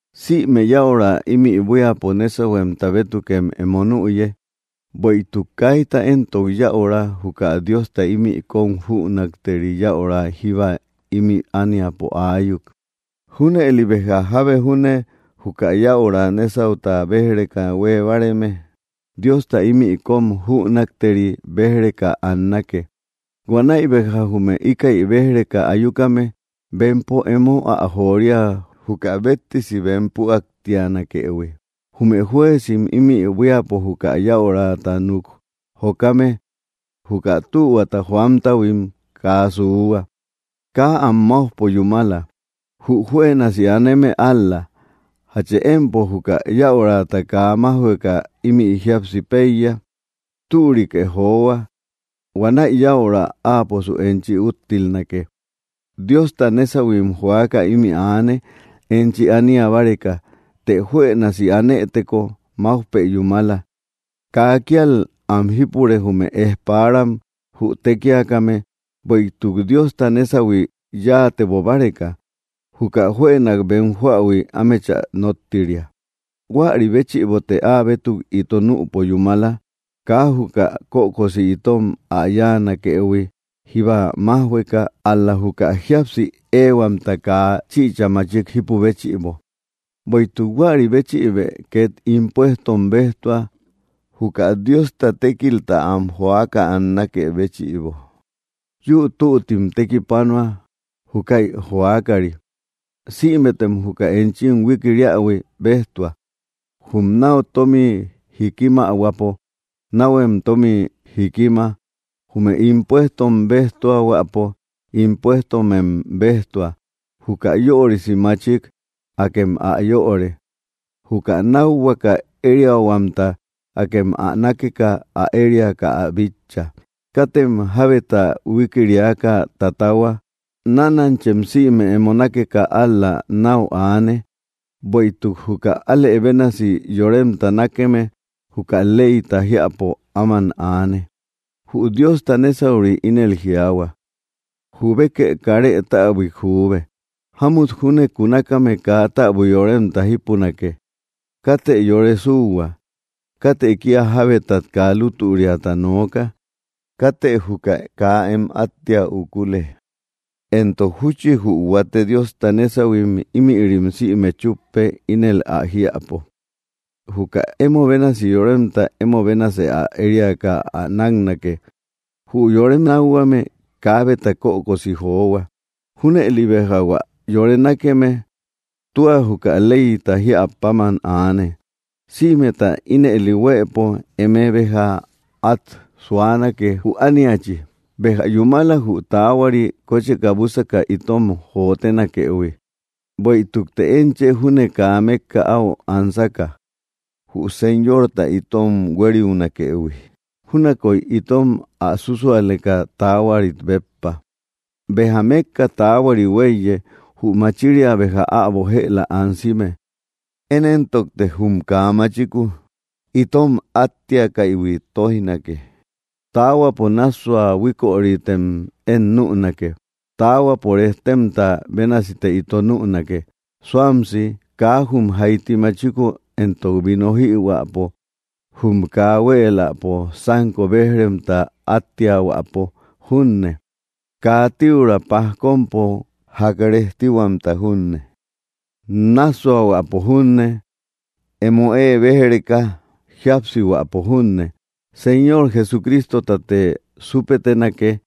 Sïme yäura ímï buíapo nésahuemta bétukem emo nüye; bueïtuk kaita éntok yäura, juka Diosta ímï kóm jünakteri yäura jíba ímï ániapo aayuk. Júnëli béja jábe junne juka yäura nesauta béj‑reka huée báareme, Diosta ímï kóm jünakteri béj‑reka annake. Huanäi béja jume íkäi béj‑reka ayukame, bempo emo ä joria, juka béttesi bem püaktianakëhui. Jume jueezim ímï buíapo juka yäurata núk jokame juka tühuata joamtahuim kaa suuhua. Kaa am máujpo yúmala; jü juënasi aneme ál‑la. ¿Jachë empo juka yäurata kaa májhueka ímï jíapsi péiya? Türikë johua; huanäi yäura áaposu enchi úttilnake. Diosta nésahuim joaka ímï aane, enchi ania báreka. Të juënasi anëteko, máujpë yúmala; kaa kíal am jípure, jume ejparam, jü tékiakame, bueïtuk Diosta nésahui yáatebo báreka, juka juënak bem joähui ámechä nóttiria. Huäri béchïbote áabétuk ito nüpo yúmala, kaa juka kökosi itom ä yáanakëhui jíba májhueka, ál‑la juka jíapsi ehuamta kaa chichä machik jipü béchïbo. Bueïtuk huäri béchïbë két impuestom béjtua, juka Diosta tékilta am joaka annakë béchïbo. Yüu tüttim tekipanua, júkäi joakari. Sïmetem juka enchim huikiriähui béjtua: Jum náu tómi jíkimahuäpo, náuhuem tómi jíkima; jume impuestom béjtuahuäpo, impuestomem béjtua; juka yörisi maachik, akem ä yöre; juka nákhuaka ériahuamta, akem ä nákeka ä ériaka ä bitcha. Katem jábeta huikiriaka tatahua; nánanchem sïme emo nákeka ál‑la náu aane; bueïtuk juka alë bénasi yoremta nákeme, juka leyta jiäpo áman aane. Jü Diosta nesauri ínel jiaahua: “Jubekë karë täbuik juube, jámut junne kunakame kaa täbui yoremta jípunake; katë yore suuhua; katë kía jábetat kaa lútüriata nooka; katë juka kaa em áttia ukule”; entok júchi jü huate Diosta nésahuim, ímïrim sïme chúppe, ínel ä jiäpo: “Juka emo bénasi yoremta emo bénasë ä ériaka ä náknake.” Jü yore nákhuame kaabeta kökosi johua; junëli béja hua yore nákeme tua juka leyta jíä páman aane. Sïmeta ínëli huëpo eme béja át suanake, jü ániachi. Béja yúmala, jü taahuari, kócheka búsaka itom jotenakëhui. Bueïtukte én chë júne kaa mékka áu ansaka, jü Señorta itom huériunakëhui, júnakoy itom ä súsualeka taahuarit béppa. Béja mékka tukaari huéiye; jü machiria béja äbo jëla ansime. Én éntokte jum kaa machiku itom attiakaïhui tóijnake. Taahuapo nássua huíkörimtem én nünake. Taahuapo rejtemta bénasite ito nünake, suamsi; kaa jum jaiti machiku entok vino jïhuäpo, jum kaa huéeläpo sánko béj‑remta áttiahuäpo junne, kaa tiuraa pajkompo ják rejtihuamta junne, nássuahuäpo junne, emo ée béj‑reka jíapsihuäpo junne. Señor Jesucristotate súpetenake,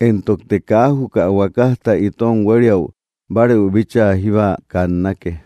entokte kaa juka huakajta itom huériu bárëu bíchaa jíba kannake.